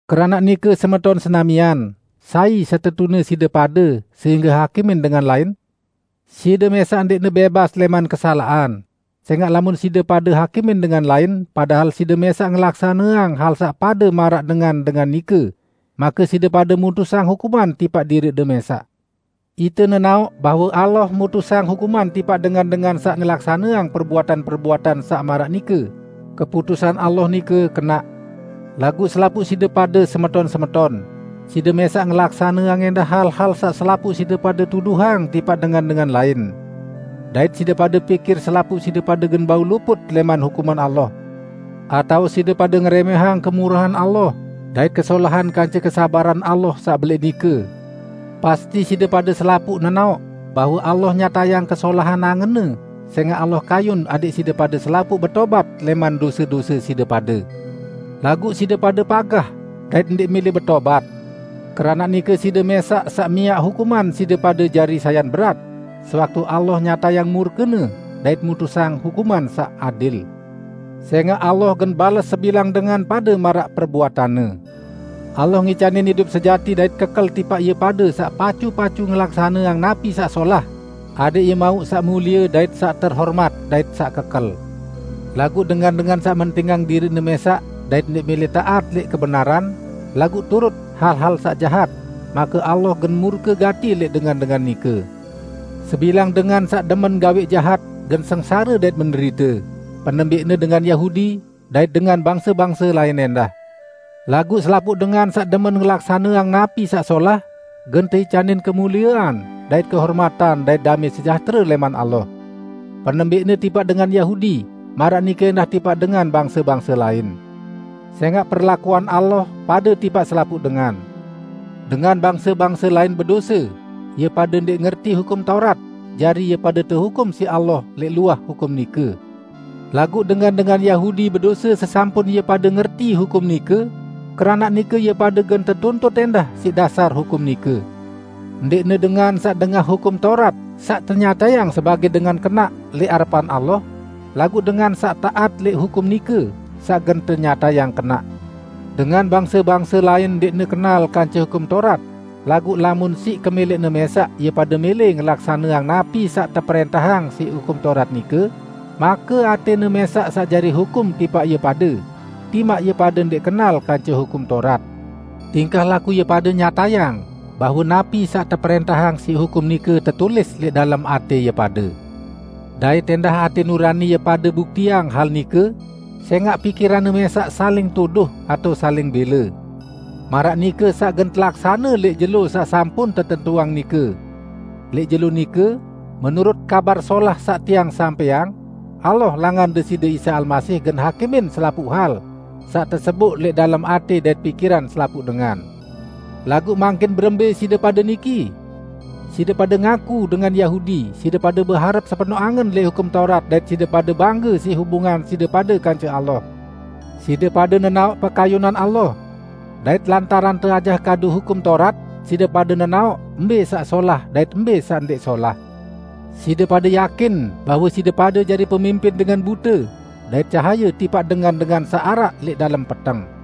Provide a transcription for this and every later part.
Keranaq nike semeton senamian, sai setetune side pade sehingge hakimin dengan lain? Side mẽsaq ndẽqne bẽbas lẽman kesalaqan, sẽngaq lamun side pade hakimin dengan lain padahal side mẽsaq ngelaksaneang hal saq pade maraq dengan-dengan nike, make side pade mutusang hukuman tipaq diriqde mẽsaq. Ite nenaoq bahwe Allah mutusang hukuman tipaq dengan-dengan saq ngelaksaneang perbuatan-perbuatan saq maraq nike, keputusan Allah nike kenaq. Laguq selapuq side pade, semeton-semeton, side mẽsaq ngelaksaneang ẽndah hal-hal saq selapuq side pade tuduhang tipaq dengan-dengan lain! Dait side pade pikir selapuq side pade gen bau luput lẽman hukuman Allah? Atao side pade ngerẽmẽhang kemurahan Allah dait kesolahan kance kesabaran Allah saq belẽq nike? Pasti side pade selapuq nenaoq bahwe Allah nyatayang kesolahan angen-Ne sẽngaq Allah kayun adẽq side pade selapuq betobat lẽman dose-dose side pade. Laguq side pade pagah dait ndẽq mẽlẽ betobat. Keranaq nike side mẽsaq saq miaq hukuman side pade jari sayan berat, sewaktu Allah nyatayang murke-Ne dait mutusang hukuman saq adil. Sẽngaq Allah gen bales sebilang dengan pade maraq perbuatanne. Allah ngicanin idup sejati dait kekel tipaq ie pade saq pacu-pacu ngelaksaneang napi saq solah, adẽq ie mauq saq mulie dait saq terhomat, dait saq kekel. Laguq dengan-dengan saq mentingang diriqne mẽsaq dait ndẽq mẽlẽ taat lẽq kebenaran, laguq turut hal-hal saq jahat, make Allah gen murke gati lẽq dengan-dengan nike. Sebilang dengan saq demen gawẽq jahat gen sengsare dait menderite, penembẽqne dengan Yahudi, dait dengan bangse-bangse lain ẽndah. Laguq selapuq dengan saq demen ngelaksaneang napi saq solah gen teicanin kemuliean dait kehormatan dait damẽ sejahtere lẽman Allah. Penembẽqne tipaq dengan Yahudi maraq nike ẽndah tipaq dengan bangse-bangse lain. Sẽngaq perlakuan Allah pade tipaq selapuq dengan. Dengan bangse-bangse lain bedose, ie pade ndẽq ngerti Hukum Taurat, jari ie pade tehukum siq Allah lẽq luah hukum nike. Laguq dengan-dengan Yahudi bedose sesampun ie pade ngerti hukum nike, keranaq nike ie pade gen tetuntut ẽndah siq dasar hukum nike. Ndẽqne dengan saq dengah Hukum Taurat saq tenyatayang sebagẽ dengan kenaq lẽq arepan Allah, laguq dengan saq taat lẽq hukum nike, saq gen tenyatayang kenaq. Dengan bangse-bangse lain ndẽqne kenal kance Hukum Taurat, laguq lamun siq kemẽlẽqne mẽsaq ie pade mẽlẽ ngelaksaneang napi saq teprẽntahang siq Hukum Taurat nike, make atẽne mẽsaq saq jari hukum tipaq ie pade, timaq ie pade ndẽq kenal kance Hukum Taurat. Tingkah laku ie pade nyatayang bahwe napi saq teprẽntahang siq hukum nike tetulis lẽq dalem atẽ ie pade. Dait ẽndah atẽ nurani ie pade buktiang hal nike, sẽngaq pikiranne mẽsaq saling tuduh atao saling bẽle. Maraq nike saq gen telaksane lẽq jelo saq sampun tetentuang nike. Lẽq jelo nike -- menurut Kabar Solah saq tiang sampẽang, Allah langan Deside Isa Almasih gen hakimin selapuq hal saq teseboq lẽq dalem atẽ dait pikiran selapuq dengan. Laguq mangkin berembẽ side pade niki? Side pade ngaku dengan Yahudi, side pade beharep sepenoq angen lẽq Hukum Taurat dait side pade bangge siq hubungan side pade kance Allah. Side pade nenaoq pekayunan Allah. Dait lantaran teajah kadu Hukum Taurat, side pade nenaoq mbẽ saq solah dait mbẽ saq ndẽq solah. Side pade yakin bahwe side pade jari pemimpin dengan bute dait cahaye tipaq dengan-dengan saq araq lẽq dalem peteng.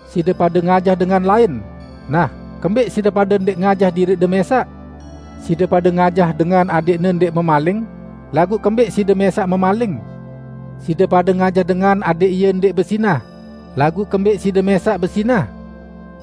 Side pade ngajah dengan lain, nah kembẽq side pade ndẽq ngajah diriqde mẽsaq? Side pade ngajah dengan adẽqne ndẽq memaling, laguq kembẽq side mẽsaq memaling? Side pade ngajah dengan adẽq ie ndẽq bezinah, laguq kembẽq side mẽsaq bezinah?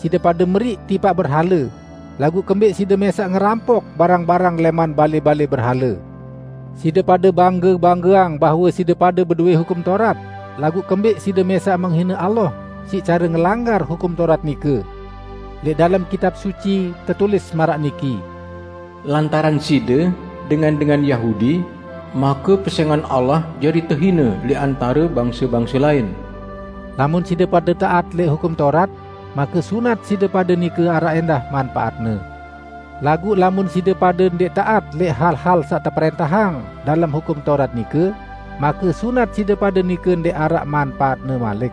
Side pade meriq tipaq berhale, laguq kembẽq side mẽsaq ngerampok barang-barang lẽman balẽ-balẽ berhale. Side pade bangge-banggeang bahwe side pade bedowẽ Hukum Taurat, laguq kembẽq side mẽsaq menghine Allah siq care ngelanggar Hukum Taurat nike. Lẽq dalem Kitab Suci tetulis maraq niki, "Lantaran side, dengan-dengan Yahudi, make pesẽngan Allah jari tehine lẽq antare bangse-bangse lain." Lamun side pade taat lẽq Hukum Taurat, make sunat side pade nike araq ẽndah manpaatne. Laguq lamun side pade ndẽq taat lẽq hal-hal saq teprẽntahang dalem Hukum Taurat nike, make sunat side pade nike ndẽq araq manpaatne malik.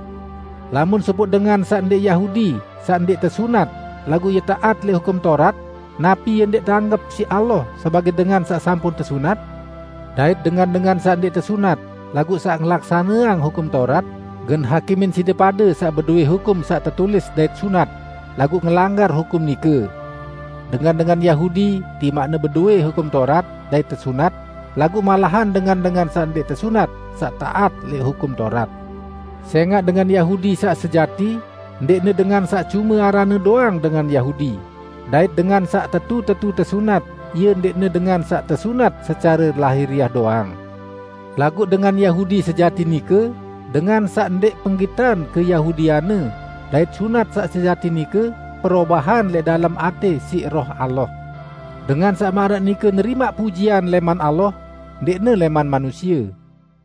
Lamun sopoq dengan saq ndẽq Yahudi saq ndẽq tesunat, laguq ie taat lẽq Hukum Taurat, napi ie ndẽq teanggep siq Allah sebagẽ dengan saq sampun tesunat? Dait dengan-dengan saq ndẽq tesunat laguq saq ngelaksaneang Hukum Taurat, gen hakimin side pade saq bedowẽ hukum saq tetulis dait sunat, laguq ngelanggar hukum nike. Dengan-dengan Yahudi timaqne bedowẽ Hukum Taurat dait tesunat, laguq malahan dengan-dengan saq ndẽq tesunat saq taat lẽq Hukum Taurat. Sẽngaq dengan Yahudi saq sejati ndẽqne dengan saq cume aranne doang dengan Yahudi, dait dengan saq tetu-tetu tesunat ie ndẽqne dengan saq tesunat secare lahiriah doang. Laguq dengan Yahudi sejati nike, dengan saq ndẽq penggitan keyahudianne dait sunat saq sejati nike perobahan lẽq dalem atẽ siq Roh Allah. Dengan saq maraq nike nerimaq pujian lẽman Allah, ndẽqne lẽman manusie.